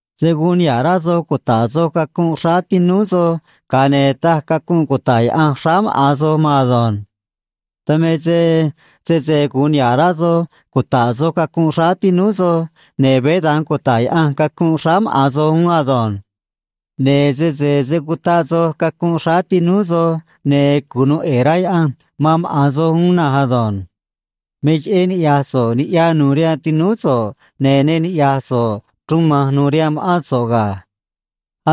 ’Se̱ guun niha̱ꞌ rá soj cuta̱ꞌ soj cacunꞌ xráá tinúú soj, ga̱a ne̱ taj cacunꞌ cuta̱ꞌ Yaꞌanj xráá maꞌa̱n soj maan ado̱nj. Dan me se sese gu̱un niha̱ꞌ rá soj cuta̱ꞌ soj cacunꞌ xráá tinúú soj, ne̱ veé da̱nj cuta̱ꞌ Yaꞌanj cacunꞌ xráá maꞌa̱n soj uún ado̱nj. Ne̱ sese se̱ cutaꞌ soj cacunꞌ xráá tinúú soj, ne̱ cunu̱u ꞌe̱e̱ rá Yaꞌanj man maꞌa̱n soj uún na̱nj ado̱nj. Me cheꞌé niꞌya̱j so̱ꞌ niꞌya nu̱u̱ rihaan tinúú so̱ꞌ, ne̱ ne niꞌya̱j so̱ꞌ chruun ma̱nj nu̱u̱ rihaan ma̱ꞌán so̱ꞌ ga̱.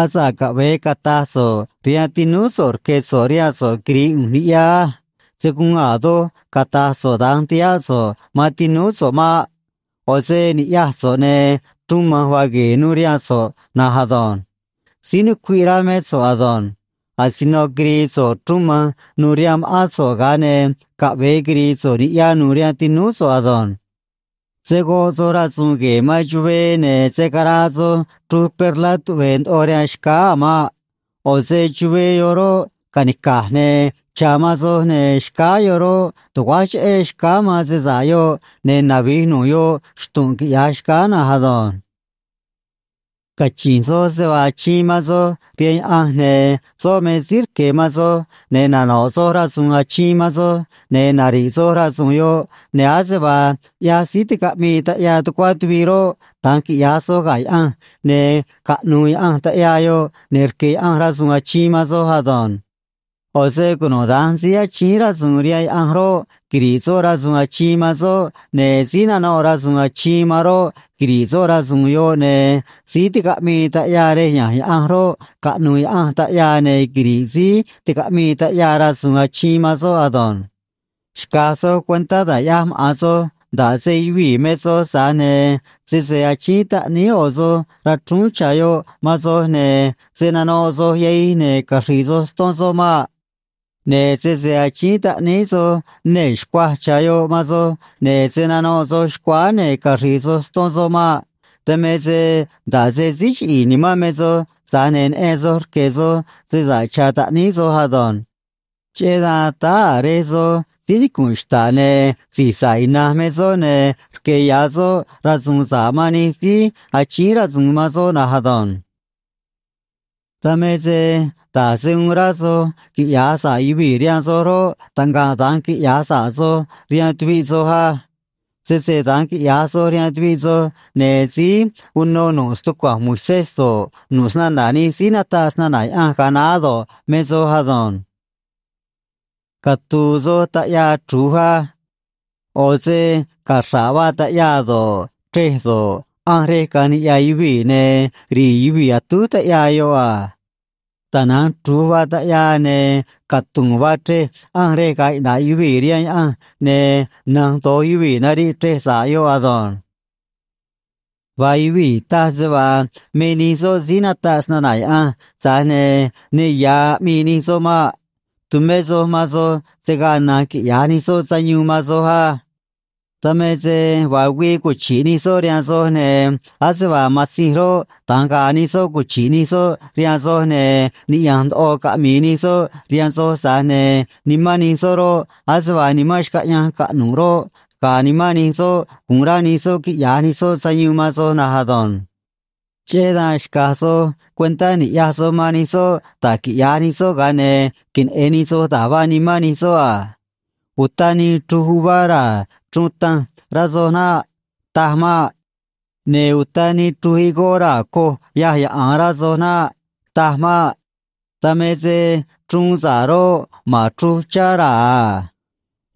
Asa̱ꞌ caꞌve̱e cata̱j so̱ꞌ rihaan tinúú so̱ꞌ: “Rque̱ so̱ꞌ rihaan so̱ꞌ quiri̱i̱ ꞌu̱nj niꞌya á.” Se̱ guun a̱ doj cata̱j so̱ꞌ da̱nj ti̱háꞌ so̱ꞌ man tinúú so̱ꞌ maꞌ. ꞌO̱ se ni̱ꞌyaj so̱ꞌ, ne̱ chruun ma̱nj vaa gue̱e̱ nuû rihaan so̱ꞌ na̱nj ado̱nj. Síí nucuiꞌ rá mé so̱ꞌ ado̱nj. Asino quiri̱i̱ so̱ꞌ chruun ma̱nj nu̱u̱ rihaan ma̱ꞌán so̱ꞌ, ga̱a ne̱ caꞌve̱e quiri̱i̱ so̱ꞌ niꞌya nu̱u̱ rihaan tinúú so̱ꞌ ado̱nj. ’Se̱ goꞌ soj rasu̱u̱n gue̱e̱ man chuvee, ne̱ se̱ caraa soj chruj perlá tuꞌve̱e̱ ndoꞌo rihaan xcáá a̱ maꞌ. ꞌO̱ se chuvee yoꞌ roꞌ, ca̱nica̱j ne̱ cha̱ man soj, ne̱ xcáá yoꞌ roꞌ, tu̱guáj cheꞌé xcáá man se sa̱ꞌ yoꞌ, ne̱ navi̱j nu̱ꞌ yoꞌ xtu̱nꞌ, quiꞌya̱j xcáá na̱nj ado̱nj. ’Cachi̱nj soj se vaa achiin man soj rihaan Yaꞌanj, ne̱ soꞌ me síí rque̱ man soj, ne̱ nano̱ꞌ soj rasu̱u̱n achiin man soj, ne̱ nari̱ꞌ soj rasu̱u̱n yoꞌ, ne̱ ase vaa ꞌyaj síí ticaꞌmii taꞌyaa tucuá tuviꞌ roꞌ, da̱nj quiꞌya̱j soj ga̱ Yaꞌanj, ne̱ caꞌnu̱u̱ Yaꞌanj taꞌyaa yoꞌ, ne̱ rque̱ Yaꞌanj rasu̱u̱n achiin man soj ado̱nj. ꞌO̱ se cunuda̱nj síí achíín rasu̱u̱n rihaan Yaꞌanj roꞌ, quiri̱ꞌ soꞌ rasu̱u̱n achiin man soꞌ, ne̱ síí nanoꞌ rasu̱u̱n achiin man roꞌ, quiri̱ꞌ soꞌ rasu̱u̱n yoꞌ, ne̱ síí ticaꞌmii taꞌyaa rej ya̱nj Yaꞌanj roꞌ, caꞌnu̱u̱ Yaꞌanj taꞌyaa, ne̱ quiri̱ꞌ síí ticaꞌmii taꞌyaa rasu̱u̱n achiin man soꞌ ado̱nj. ’Xca̱j soj cuentá da̱j ꞌyaj maꞌa̱n soj, nda̱ꞌ se yuvii̱ me soj, tza̱j ne̱ sese achíín taꞌníí ꞌo̱ soj rachrúún cha̱ yoꞌ man soj, ne̱ se̱ nanoꞌ soj yahij ne̱ caxri̱i̱ soj ston soꞌ maꞌ. Ne̱ sese achíín taꞌníí soj nee̱ xcuaj cha̱ yoꞌ man soj, ne̱ se̱ nanoꞌ soj xcuáá ne̱ caxri̱i̱ soj ston soꞌ maꞌ. Dan me se nda̱ꞌ se síí chiꞌi̱i̱ nimán me soj, tza̱j ne̱ neꞌen soj rque̱ soj se sa̱ꞌ cha̱ taꞌníí soj ado̱nj. Cheꞌé dan táá a̱ Rej soj síí nicu̱nꞌ xta̱ꞌ, ne̱ si̱j sa̱ꞌ ina̱nj me soꞌ, ne̱ rque̱ ya̱ soꞌ rasu̱u̱n sa̱ꞌ man nij síí achíín rasu̱u̱n man soꞌ na̱nj ado̱nj. ’Dan me se da̱j se uun rá soj quiꞌya̱j sa̱ꞌ yuvii̱ rihaan soj roꞌ, taꞌngaꞌ da̱nj quiꞌya̱j sa̱ꞌ soj rihaan tuviꞌ soj á. Sese da̱nj quiꞌya̱j soj rihaan tuviꞌ soj, ne̱ síí uno nu̱ꞌ stucua̱nj Moisés do̱ꞌ, nu̱ꞌ snana̱ nij síí nataꞌ snana̱ Yaꞌanj ga̱a naá do̱ꞌ, me soj ado̱nj. ’Catu̱u̱ soj taꞌyaa chru̱j á. ꞌO̱ se caxra̱ꞌ vaa taꞌyaa do̱ꞌ, chrej do̱ꞌ, ꞌanj rej caꞌa̱nj niꞌya̱ yuvii̱, ne̱ ri̱i̱ yuvii̱ atúj taꞌyaa yoꞌ a. Tana̱nj chru̱j vaa taꞌyaa ne̱ catu̱u̱n vaa chrej ꞌanj rej ga̱a̱ iꞌna̱ꞌ yuvii̱ rihaan Yaꞌanj, ne̱ na̱nj do̱j yuvii̱ nariꞌ chrej sa̱ꞌ yoꞌ ado̱nj. ’Vaa yuvii̱ taj se vaa me nij soꞌ síí nataꞌ snana̱ Yaꞌanj, tza̱j ne̱ ne ya̱ aꞌmii nij soꞌ maꞌ. Tu̱mé soj man soj, se̱ gaa na̱nj quiꞌya̱j nij soꞌ sayuun man soj á. Dan me se vaa güii cuchi̱ꞌ nij soꞌ rihaan soj, ne̱ ase vaa matzinj roꞌ, da̱nj ga̱a̱ nij soꞌ cuchi̱ꞌ nij soꞌ rihaan soj, ne̱ niꞌya̱nj ndoꞌo caꞌmi̱i̱ nij soꞌ rihaan soj, tza̱j ne̱ nimán nij soꞌ roꞌ, ase vaa nimán xcaꞌyanj caꞌnu̱ꞌ roꞌ, ga̱a̱ nimán nij soꞌ, gu̱un rá nij soꞌ quiꞌya̱j nij soꞌ sayuun man soj na̱nj ado̱nj. Cheꞌé dan xca̱j soj cuentá ni̱ꞌyaj soj man nij soꞌ da̱j quiꞌya̱j nij soꞌ, ga̱a ne̱ queneꞌe̱n nij soj da̱j vaa nimán nij soꞌ a. Uta nii chruj uvá raa̱ chruun tanj, rá soj naꞌ. Taj maꞌ. Ne̱ uta nii chruj higó raa̱ coj yâj yaꞌa̱a, rá soj naꞌ. Taj maꞌ. Dan me se chruun sa̱ꞌ roꞌ, ma̱n chruj chá raa̱ a.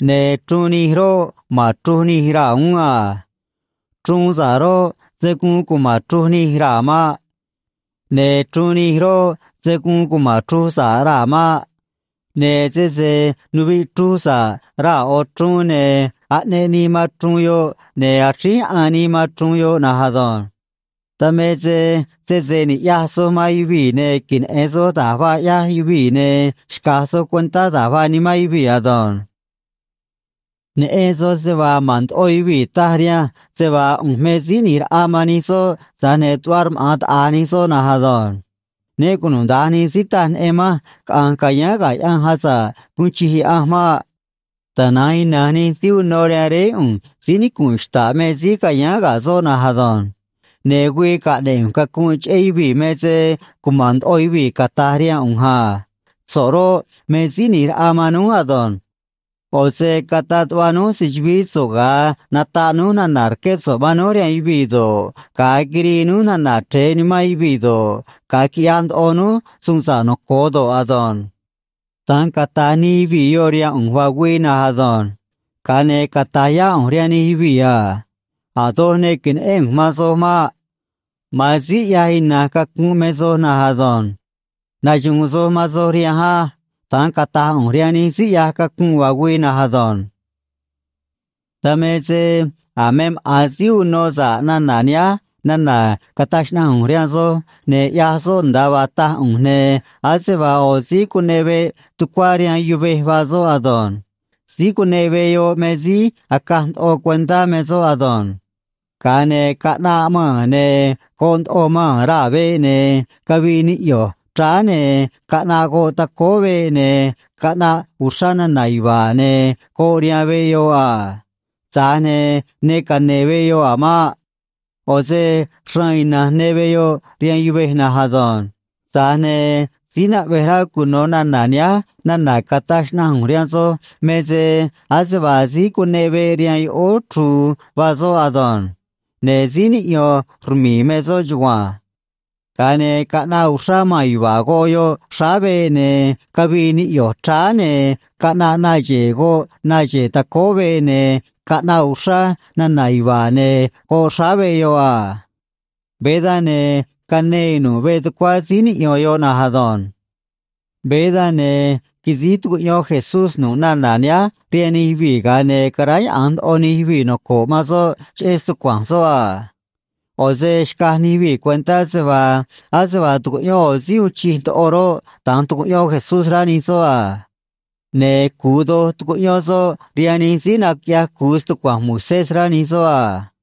Ne̱ chruun nij roꞌ, ma̱n chruj nij raa̱ uún a. Chruun sa̱ꞌ roꞌ, se̱ guun cuma̱n chruj nij raa̱ maꞌ. Ne̱ chruun nij roꞌ, se̱ guun cuma̱n chruj sa̱ꞌ raa̱ maꞌ. Ne̱ sese nuviꞌ chruj sa̱ꞌ raa̱ ꞌo̱ chruun, ne̱ aꞌneꞌ nii man chruun yoꞌ, ne̱ axríj yaꞌan nii man chruun yoꞌ na̱nj ado̱nj. Dan me se sese niꞌya̱j soj man yuvii̱ ne̱ queneꞌe̱n soj da̱j vaa ꞌyaj yuvii̱, ne̱ xca̱j soj cuentá da̱j vaa nimán yuvii̱ ado̱nj. ’Neꞌen soj se vaa ma̱n ndoꞌo yuvii̱ taj rihanj se vaa ꞌu̱nj me Síí ꞌNi̱j Raꞌa man nij soꞌ, tza̱j ne̱ tuꞌva rmaꞌa̱n taꞌa̱j nij soꞌ na̱nj ado̱nj. Né cunuda̱nj nij síí taj neꞌen manj caꞌa̱nj ca̱yáán ga̱ Yaꞌanj asa̱ꞌ guun chij Yaꞌanj maꞌ. Tana̱nj ina̱nj nij síí uno rihaan Réé ꞌu̱nj síí nicu̱nꞌ xta̱ꞌ me síí ca̱yáán ga̱ soꞌ na̱nj ado̱nj. Ne̱ güii caꞌne̱ꞌ ꞌu̱nj cacunꞌ cheꞌé yuvii̱ me se cuma̱n ndoꞌo yuvii̱ cata̱j rihaan ꞌu̱nj a: “So̱ꞌ roꞌ, me Síí ꞌNi̱j Raꞌa man núj ado̱nj. ꞌO̱ se cataꞌ tuꞌva núj se‑chu̱vií so̱ꞌ ga̱a nataꞌ núj nana̱ rqué so̱ꞌ man núj rihaan yuvii̱ do̱ꞌ, ga̱a quirii núj nana̱ chre̱e nimán yuvii̱ do̱ꞌ, ga̱a quiꞌyaj ndoꞌo núj suun sa̱ꞌ noco̱o do̱ꞌ ado̱nj.” Da̱nj cata̱j nij yuvii̱ yoꞌ rihaan ꞌu̱nj vaa güii na̱nj ado̱nj. Ga̱a ne̱ cata̱j yá ꞌu̱nj rihaan nij yuvii̱ a: “A̱ doj ne que̱neꞌén ꞌu̱nj man soj maꞌ. Ma̱an síí ꞌyaj ina̱nj cacunꞌ me soj na̱nj ado̱nj. Naxu̱u̱n soj man soj rihanj á.” Da̱nj cata̱j ꞌu̱nj rihaan nij síí ꞌyaj cacunꞌ vaa güii na̱nj ado̱nj. ’Dan me se a̱ me maꞌa̱n síí uno sa̱ꞌ nana̱ nihánj nana̱ cataj xnaꞌanj ꞌu̱nj rihaan soj ne̱ ꞌyaj soꞌ nda̱a vaa taj ꞌu̱nj, ne̱ ase vaa ꞌo̱ síí cuneꞌ veꞌ tucuá rihaan yuvej vaa soꞌ ado̱nj. Síí cuneꞌ veꞌ yoꞌ me se síí acaj ndoꞌo cuentá me soꞌ ado̱nj. Ga̱a ne̱ caꞌnaꞌ maa̱n, ne̱ goꞌ ndoꞌo maa̱n raa̱ veꞌ, ne̱ cavii niꞌyo̱j chráá, ne̱ caꞌnaꞌ goꞌ tacóó veꞌ, ne̱ caꞌnaꞌ uxrá nana̱ yuva̱a̱, ne̱ goꞌ rihaan veꞌ yoꞌ a. Tza̱j ne̱ ne cane̱e̱ veꞌ yoꞌ a̱ maꞌ. ꞌO̱ se xraan ina̱nj ne veꞌ yoꞌ rihaan yuvej na̱nj ado̱nj. Tza̱j ne̱ síí naꞌvej rá cuno̱ nana̱ nihánj nana̱ cataj xnaꞌanj ꞌu̱nj rihaan soj me se ase vaa síí cuneꞌ veꞌ rihaan yoꞌóó chru̱u̱ vaa soꞌ ado̱nj. Ne̱ síí niꞌyo̱n rmi̱i̱ me soꞌ chugua̱nj. Ga̱a ne̱ caꞌnaꞌ uxrá maa̱n yuva̱a̱ goꞌ yoꞌ xráá veꞌ, ne̱ cavii niꞌyo̱j chráá, ne̱ caꞌnaꞌ na xe̱e̱ goꞌ na xe̱e̱ tacóó veꞌ, ne̱ caꞌnaꞌ uxrá nana̱ yuva̱a̱ ne̱ goꞌ xráá veꞌ yoꞌ a. Veé dan, ne̱ canee nu̱ꞌ veꞌ tucuá síí niꞌyo̱n yoꞌ na̱nj ado̱nj. Veé dan, ne̱ quisíj tucuꞌyón Jesús nu̱ꞌ nana̱ nihánj rihaan nij yuvii̱, ga̱a ne̱ caráyaꞌa̱nj ndoꞌo nij yuvii̱ noco̱ꞌ man soꞌ cheꞌé stucua̱nj soꞌ a. ꞌO̱ se xcaj nij yuvii̱ cuentá se vaa ase vaa tucuꞌyón ꞌo̱ síí uun chij ndoꞌo roꞌ, da̱nj tucuꞌyón Jesús, rá nij soꞌ a. Ne̱ cu̱u doj tucuꞌyón soꞌ rihaan nij síí naquiꞌyaj cu̱u stucua̱nj Moisés, rá nij soꞌ a.